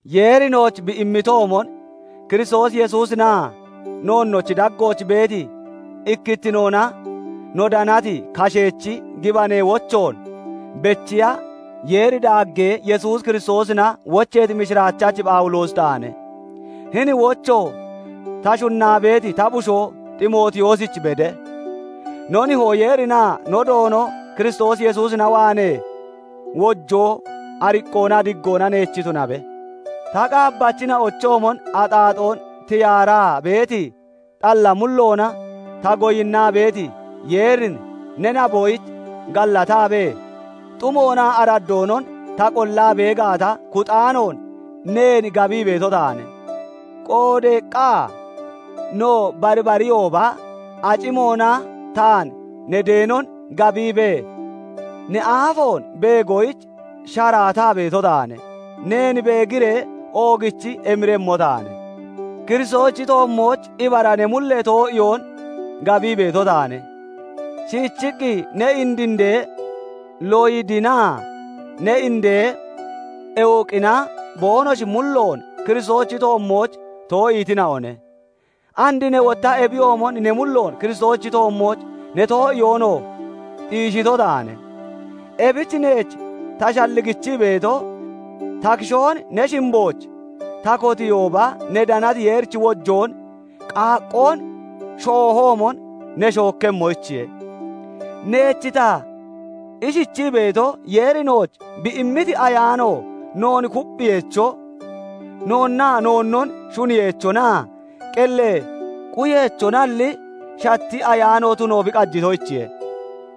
Yeeri nooch bi immitoomon Kiristoos Yesuusinaa noonnochi daggooch beeti ikkittinoona no danati kasheechi gibanee wochoon bechiya Yeeri daaggee Yesuus Kiristoosina wocheeti mishiraachachi Phawuloosi taane; hini wocho ta shunnaa beeti ta bushoo Ximootiyoosich bede. No Nihoo Yeerinaa no Doono Kiristoos Yesuusina waanee wojoo, ariqqoonaa diggoona neech tunabe. Ta qaabbachina'ochoomon axaaxoon tiyaaraa beeti xalla mulloona ta goyinnaa beeti Yeerin ne naboyich gallataabee, xumoonaa araddoonon ta qollaa bee gaata kuxaanoon neen gabii beeto taane. Qoodeeqqa no barbariyooba acimoona taan ne deenon gabiibee, ne aafoon beegoyich sharaataa beeto taane; neen beegiree oogichi emiremmo taane. Kiristoosichi toommooch ibara ne mullee too'iyoon gabii beeto taane; shiichiqqi ne indinde Loyidinaa ne indee Ewuqina boonoshi mulloon Kiristoosichi toommooch too'iitina'one; and ne wotta ebiyoomon ne mulloon Kiristoosichi toommooch ne too'iyoonoo xiishito taane. Ebich neech ta shalligichii beeto, ta kishoon ne shimbooch ta kotiihooba ne danati Yeerichi wojoon qaaqqoon shoohoomon ne shookkemmoyichiye. Neech ta ishichii beeto, Yeeri nooch bi immiti Ayaano noon kupphiyeecho, noonnaa noonnon shuniyeechonaa qellee quyeechonalli, shatti ayaano tuno bi qajitoyichiye.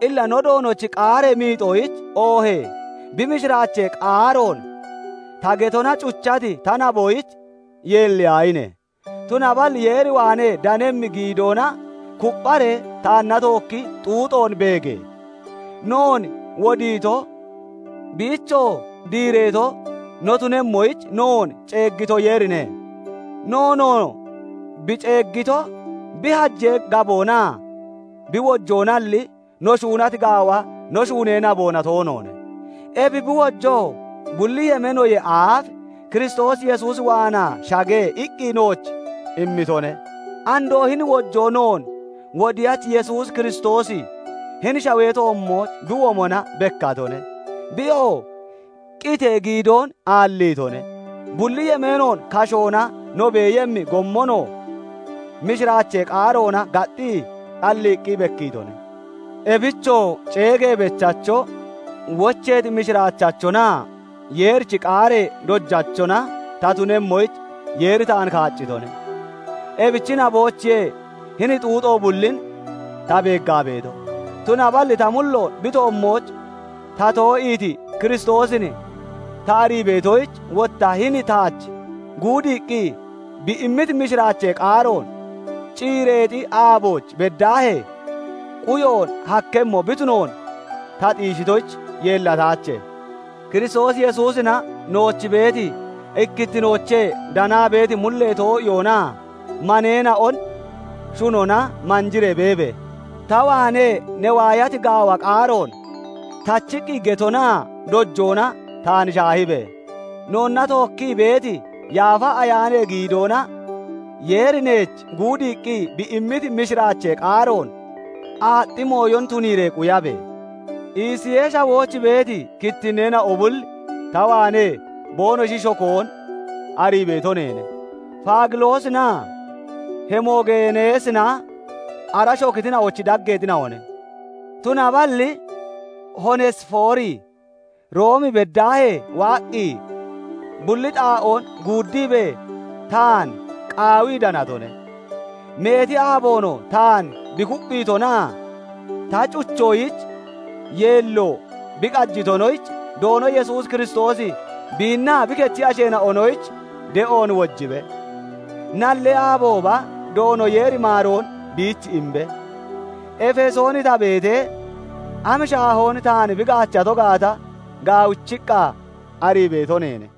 Illa no Doonochi qaaree miixoyich, oohee bi mishiraachee qaaroon ta getona cuchati ta naboyich yeelliyaahine! Tunaballi Yeer waanee danemmi giidoona kuppharee taanna tookki xuuxoon beege! Noon wodiito, biichoo diireeto no tunemmoyich noon ceeggito Yeerine. Noonoo bi ceeggito bi hajee gaboonaa bi wojoonalli, no shuunati gaawa no shuunee naboona toonoone. Ebi bi wojoo bulli yemeenoyee aaf "Kiristoos Yesuus waanaa shage" iqqi nooch immitone. Andoo hini wojoo, noon Wodiyachi Yesuus Kiristoosi hini shawee toommooch bi womona bekkatone. Biyoo qitee giidoon aalliitone; bulli yemeenoon kashoona no beeyemmi gommonoo mishiraachee qaaroona gaxxii xalliiqqi bekkiitone. Ebichoo ceegee bechacho, wocheeti mishiraachachonaa Yeerichi qaaree dojachona ta tunemmoyich Yeeri taan kaaccitone. Ebichi naboyichiye hini xuuxo bullin ta beeggaa beeto; tunaballi ta mulloon bi toommooch ta too'iiti Kiristoosin ta arii beetoyich, wotta hini taach guudiiqqi bi immiti mishiraachee qaaroon ciireexi aabooch beddaahee quyoon hakkemmo bi tunoon ta xiishitoyich yeellataache. Kiristoos Yesuusina nooch beeti ikkittinoochee danaa beeti mullee too'iyoonaa maneena'on shunona manjiree beebe! Ta waanee ne waayati gaawa qaaroon tachiqqi getonaa dojoona taan shaahibe! Noonna tookkii beeti Yaafa Ayaanee giidoona Yeeri neech guudiiqqi bi immiti mishiraachee qaaroon aaxxi mooyon tuniiree quyabe! Isiyee Shawooch beeti kittinneena'o bulli ta waanee boonoshi shokoon arii beeto neene; Fagiloosinaa Hemogeeneesina ara shokitina'ochi daggeexina'one. Tunaballi Hoonesifoori Room beddaahee waaqqi, bulli xaa'oon guuddiibee taan qaawii danatone; meeti aaboonoo taan bi kupphiitonaa ta cuchoyich yeello bi qajitonoyich, Doono Yesuus Kiristoosi biinnaa bi kechi asheena'onoyich de'oon wojibe. Nallee aabooba Doono Yeeri maaroon biich imbe. Efesoon ta beetee, am shaahoon taan bi gaachato gaata gaawichiqqa arii beeto neene.